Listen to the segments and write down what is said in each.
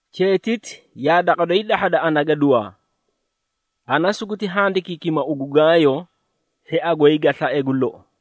Cheetiti yaa daqa doyi dahhada ana gaduwaa. Ana suguti handikiikima ugu Gaayo, hhia goy ga slae gu lou.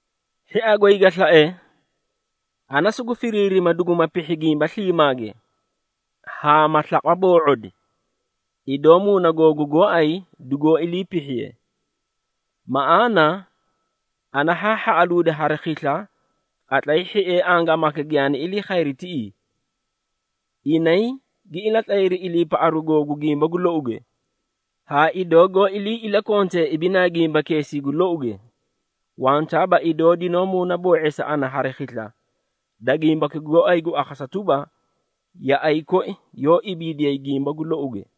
Hhia goy ga slae, ana sugu firiirima duguma pihhi gimba sliimaage, haa ma slaqwa boo⁄odi, idoo muuna googu gooay dugoó ilii pihhiye. Maꞌaana, ana haa hhaꞌaluudi hari khisla, qatlay hhiee angaamaka giyaani ilii khayri tiꞌii. Inay gi ilatlayri iliipaꞌaru googu gimba gu louge, haa idoo goó ilii ilakontee ibinaa gimbakeesii gu louge. Wantaaba idoo dinoó muunaboo⁄eesa ana hari khisla, da gimbaki gooay gu akhasa tuba, yaꞌay koi yoó ibiidiyay gimba gu louge.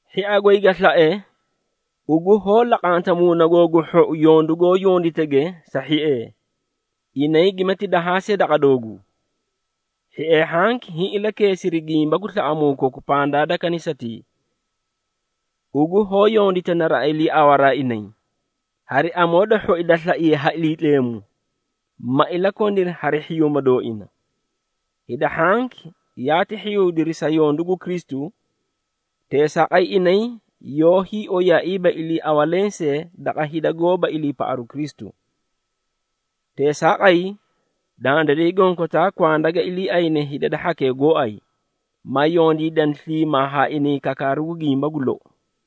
Hhia goy ga slae, ugu hoó laqanta muuna googu gu hhou yondu goó yonditege sa hhiee, inay gimati dahaa see daqa dooguu. Hhiee hhanki hiĩ ilakeesiri gimba gu slaꞌamuu koku pandaa da kanisatii. Ugu hoó yondita naraꞌa iliiawaraa inay, hari amoo da hhoi da slaiye ha Iliitleemu, ma ilakoniri hari hhiyuuma dooina. Hida hhanki yaati hhiyuudiri sa yondu gu Kristu, teesaaqay inay yoóyi oyaaiiba iliiawa lensee daqa hida goóba iliipaꞌaru Kristu. Teesaaqay, dandiray gonkotaa kwanda ga iliiayne hida da hhakee gooay, ma yondiidani sliimaa haa inay kakaaru gimba gu lou.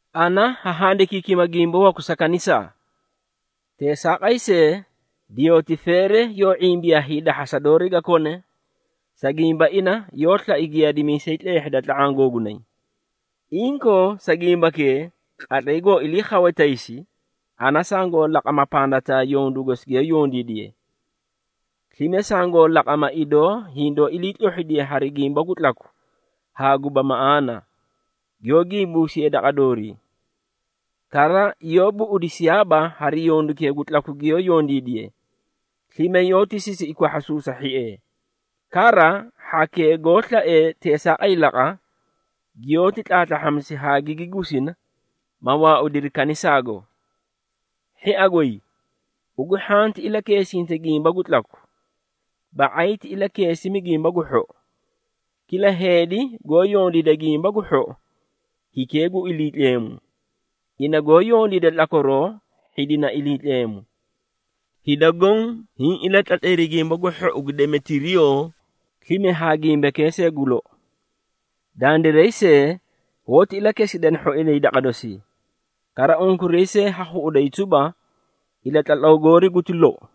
Ana haa handikimi gimba waku sa kanisaa. Teesaaqay see, Deyotireefe yoó ⁄imbiyaa hiidahhasa doori ga kone, sa gimba ina yoó slai giyaadimiisay tleehhida tla⁄aã gooinay. Inkoo, sa gimbakee, qatlay goo ilii khawe taysi, ana sangoo laqama pandataa yondu gosi giyoó yondiidiye. Slime sangoo laqama, idoo hindoó iliitlohhidiye hari gimba gu tlaku haa guba maꞌaana, giyoó gimbuumisiye daqa doorii. Kara, yoó buꞌudisiyaaba hari yondukee gu tlaku giyoó yondiidiye, slime yoóti sisiꞌi kwahhasuusa hhiee. Kara, hhakee goó slaee teesaaqay laqa, giyoóti tlaatlahhamisi haa gigi gusina, ma waaudiri kanisaago. Hhia goy, ugu hhanti ilakeesinta gimba gu tlaku, ba⁄ay ti ilakeesimi gimba gu hhou. Kila heedi goó yondiida gimba gu hhou, hikee gu Iliitleemu, ina goó yondiida tlakwaroo hhidina Iliitleemu. Hida goõ hiĩ ilatlatlayri gimba gu hhou gu Demetiriyoo, slime haa gimbakee see gu lou. Dandiray see, hoóti ilakesidana hhoinay daqa dosii, kara unkuray see ha khuꞌuday tuba, ilatlatlaw goori guti lou.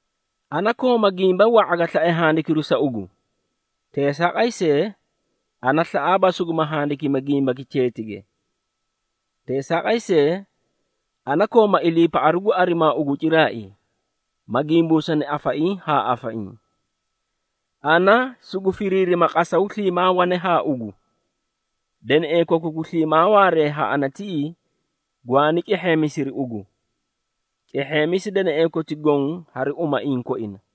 Ana kooma gimba wa⁄a ga slae handikiru sa ugu, teesaaqay see, ana slaꞌaaba suguma handikimi gimbaki cheetige. Teesaaqay see, ana kooma iliipaꞌaru gu arimaa ugu ciraai, ma gimbuusana afaiĩ haa afaiĩ. Ana sugu firiirima qasaw sliimaa wane haa ugu. Deneꞌee koku gu sliimaa waaree haa ana tiꞌii, gwaani cehheemisiri ugu. Cehheemisi deneꞌee koti goõ hari umaiĩ koina.